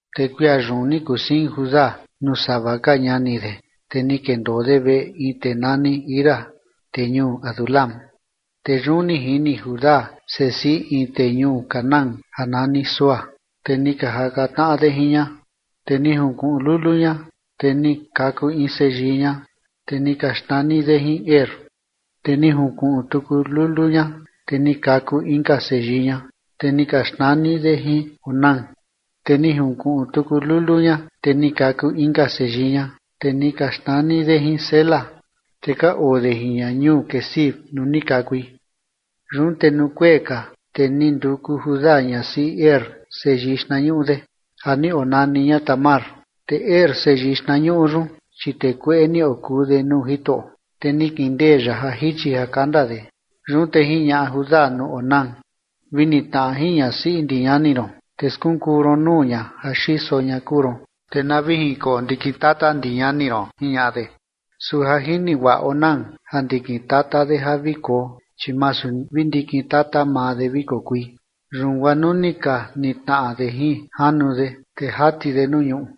Te kuia yun ni kusiin Judá nuu sava ka ñani de, te ni kendoo de veꞌe in tee nani Hira tee ñuu Adulam. Te yun ni jini Judá sesiꞌi in tee ñuu Canaán ja nani Súa, te ni ka jaka tnaꞌa de jin ña. Te ni junkuꞌun lulu ña, te ni kaku in seyii ña, te ni ka xnani de jin Er. Te ni junkuꞌun tuku lulu ña, te ni kaku inka seyii ña, te ni ka xnani de jin Onán. Te ni junkuꞌun tuku lulu ña, te ni kaku inka seyii ña, te ni ka xnani de jin Sela. Te ka oo de jin ña ñuu Quezib nuu ni kakui. Yun te nuu kuee ka, te ni nduku Judá ñasiꞌi Er seyii xtnañuꞌu de, ja ni onani ña Tamar. Te Er, seyii xtnañuꞌu yun, chi tee kueꞌe ni okuu de nuu Jitoꞌo, te ni kindee ya ja jichi ja kanda de. Yun te jiñaꞌa Judá nuu Onán: ―Vi nitnaꞌa jin ñasiꞌi ndi ñani ron, te skunkuu ron nuu ña ja xiso ña kuu ron, te na vi jinkoo ndikin tata ndi ñani ron ―jiñaꞌa de. Su ja jini guaꞌa Onán ja ndikin tata de ja vi koo, chi masu vi ndikin tata maa de vi kokui, yun guaa nuu ka nitnaꞌa de jin janu de, te jati de nuu ñuꞌu,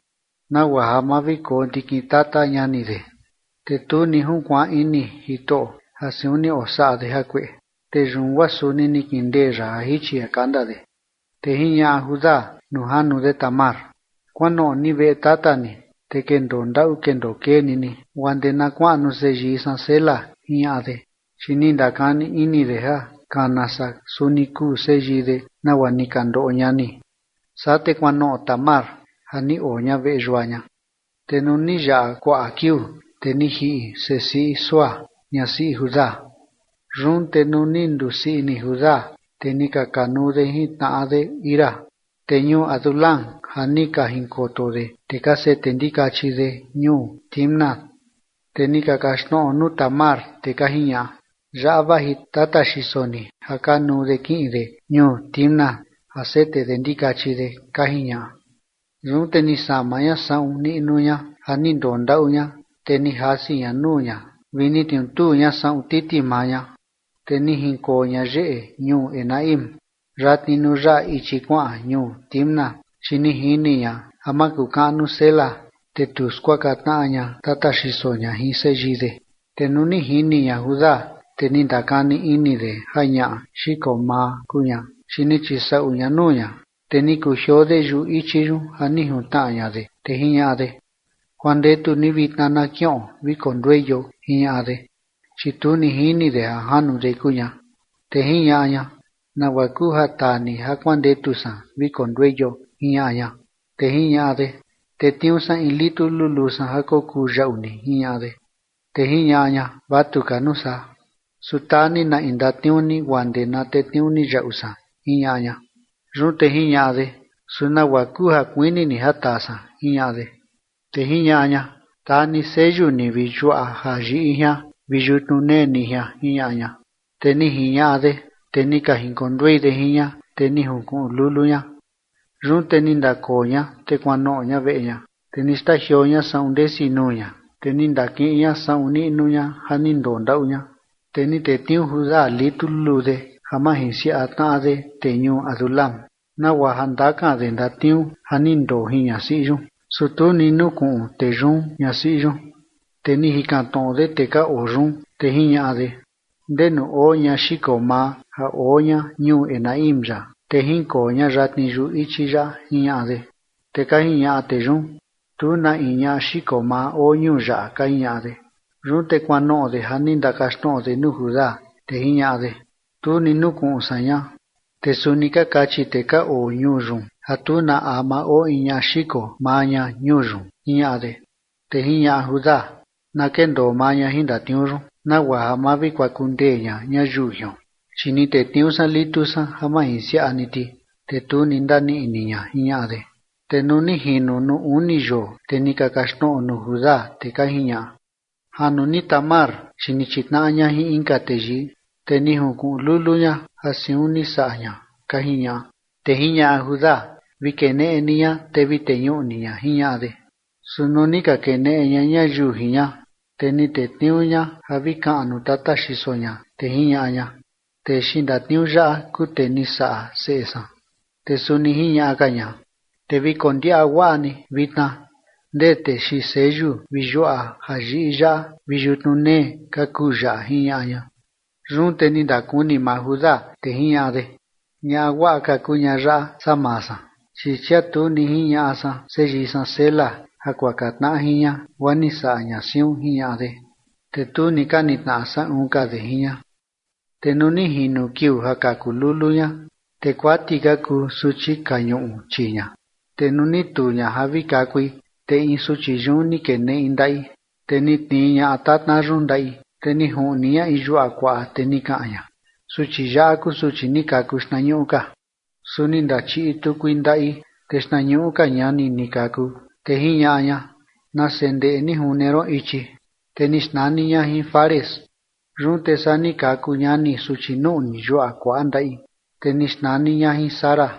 nagua ja ma vi koo ndikin tata ñani de. Te tu ni junkuaan ini Jitoꞌo ja siun ni osaꞌa de jakueꞌe, te yun guaa suni ni kindee ya ja jichi ja kanda de. Te jiñaꞌa Judá nuu janu de Tamar: ―Kuanoꞌo ni veꞌe tata ni, te kendoo ndaꞌu kendoo kee ni ni, guaa ndee na kuaꞌnu seyii san Sela ―jiñaꞌa de, chi ni ndakani ini de ja kana saa suni kuu seyii de, nagua ni ka ndoꞌo ñani. Saa te kuanoꞌo Tamar ja ni oo ña veꞌe yua ña. Te nuu ni yaꞌa kuaꞌa kiuu, te ni jiꞌi sesiꞌi Súa ñasiꞌi Judá. Yun te nuu ni nduu sii ini Judá, te ni ka kanuu de jin tnaꞌa de Hira tee ñuu Adulam ja ni ka jinkoto de tee ka sete ndikachi de ñuu Timnat. Te ni ka kaxtnoꞌo nuu Tamar, te ka jiñaꞌa: ―Yaꞌa vaji tata xiso ni ja kanuu de kiꞌin de ñuu Timnat ja sete de ndikachi de ―ka jiñaꞌa. Yun te ni sama ña saꞌun niꞌnu ña ja ni ndoo ndaꞌu ña, te ni jasi ña nuu ña vi ni tniutuu ña saꞌun titi maa ña, te ni jinkoo ña yeꞌe ñuu Enaim yatni nuu yaꞌa ichi kuaꞌan ñuu Timnat, chi ni jini ña ja makukaꞌnu Sela, te tu skuaka tnaꞌa ña tata xiso ña jin seyii de. Te nuu ni jini ña Judá, te ni ndakani ini de ja ñaꞌa xiko maa kuu ña, chi ni chisaꞌu ña nuu ña. Te ni kujioo de yuꞌu ichi yun ja ni juntnaꞌa ña de, te jiñaꞌa de: ―Kuandetu ni vitna na kiꞌon vi kondueio ―jiñaꞌa de, chi tu ni jini de ja janu de kuu ña. Te jiñaꞌa ña: ―¿Nagua kuu ja taa ni ja kuandetu san vi kondueio? ―jiñaꞌa ña. Te jiñaꞌa de: ―Tetniuu san in litu luluu san ja kokuu yaꞌu ni ―jiñaꞌa de. Te jiñaꞌa ña: ―Vatu ka nuu saa, su taa ni na in ndatniuu ni guaa ndee na tetniuu ni yaꞌu san ―jiñaꞌa ña. Yun te jiñaꞌa de: ―Su ¿nagua kuu ja kuini ni ja taa san? ―jiñaꞌa de. Te jiñaꞌa ña: ―Taa ni seyu ni vi yuaꞌa ja yiꞌi jian vi yutnu nee ni jian ―jiñaꞌa ña. Te ni jiñaꞌa de, te ni ka jinkonduei de jin ña, te ni junkuꞌun lulu ña. Yun te ni ndakoo ña te kuanoꞌo ña veꞌe ña, te ni xtajioo ña saꞌun ndesi nuu ña, te ni ndakiꞌin ña saꞌun niꞌnu ña ja ni ndoo ndaꞌu ña. Te ni tetniuu Judá litu luluu de ja majinsiaꞌa tnaꞌa de tee ñuu Adulam, nagua ja ndakan de ndatniuu ja ni ndoo jin ñasiꞌi yun, su tu ni nukuꞌun tee yun ñasiꞌi yun. Te ni jikan tnoꞌo de tee ka oo yun, te jiñaꞌa de: ―¿Ndenu oo ñaꞌa xiko maa ja oo ña ñuu Enaim yaꞌa, te jinkoo ña yatni yuꞌu ichi yaꞌa? ―jiñaꞌa de. Te ka jiñaꞌa tee yun: ―Tu na in ñaꞌa xiko maa oo ñuu yaꞌa ―ka jiñaꞌa de. Yun te kuanoꞌo de ja ni ndakaxtnoꞌo de nuu Judá, te jiñaꞌa de: ―Tu ni nukuꞌun san ña, te suni ka kachi tee ka oo ñuu yun ja tu na ama oo in ñaꞌa xiko maa ña ñuu yun ―jiñaꞌa de. Te jiñaꞌa Judá: ―Na kendoo maa ña jin ndatniuu yun, nagua ja ma vi kuaku ndee ña ñayiu jion, chi ni tetniuu san litu san ja majinsiaꞌa ni ti, te tu ni ndaniꞌi ni ña ―jiñaꞌa de. Te nuu ni jino nuu uni yoo, te ni ka kaxtnoꞌo nuu Judá, te ka jiñaꞌa: ―Janu ni Tamar, chi ni chitnaꞌa ña jin inka teyii, te ni junkuꞌun lulu ña ja siun ni saꞌa ña ―ka jiñaꞌa. Te jiñaꞌa Judá: ―Vi keneꞌe ni ña, te vi teñuꞌu ni ña ―jiñaꞌa de. Su nuu ni ka keneꞌe ña ñayiu jin ña, te ni tetniuu ña ja vi kaꞌan nuu tata xiso ña, te jiñaꞌa ña: ―Tee xiin ndatniuu yaꞌa kuu tee ni saꞌa seꞌe san. Te suni jiñaꞌa ka ña: ―Te vi kondiaꞌa guaꞌa ni vitna ndee tee xiin seyu vi yuaꞌa jayiꞌi yaꞌa vi yutnu nee, ka kuu yaꞌa ―jiñaꞌa ña. Yun te ni ndakuni maa Judá, te jiñaꞌa de: ―Ñaꞌa guaꞌa ka kuu ñaꞌa yaꞌa saa maa san, chi chia tu ni jiñaꞌa san seyii san Sela ja kuaka tnaꞌa jin ña guaa ni saꞌa ña siun ―jiñaꞌa de. Te tu ni ka nitnaꞌa saꞌun ka de jin ña. Te nuu ni jino kiuu ja kaku lulu ña, te kuati ka kuu suchi ka ñuꞌu chii ña. Te nuu ni tuu ña ja vi kakui, te in suchi yun ni keneꞌi in ndaꞌi, te ni tnii ñaꞌa tatna yun ndaꞌi, te ni juꞌni ña in yuaꞌa kuaꞌa, te ni kaꞌan ña: ―Suchi yaꞌa kuu suchi ni kaku xtnañuꞌu ka. Su ni ndachiꞌi tukui ndaꞌi, te xtnañuꞌu ka ñani ni kaku, te jiñaꞌa ña: ―¡Nase ndeꞌe ni june ron ichi! Te ni xnani ña jin Fares. Yun te saa ni kaku ñani suchi nuꞌni yuaꞌa kuaꞌa ndaꞌi, te ni xnani ña jin Zara.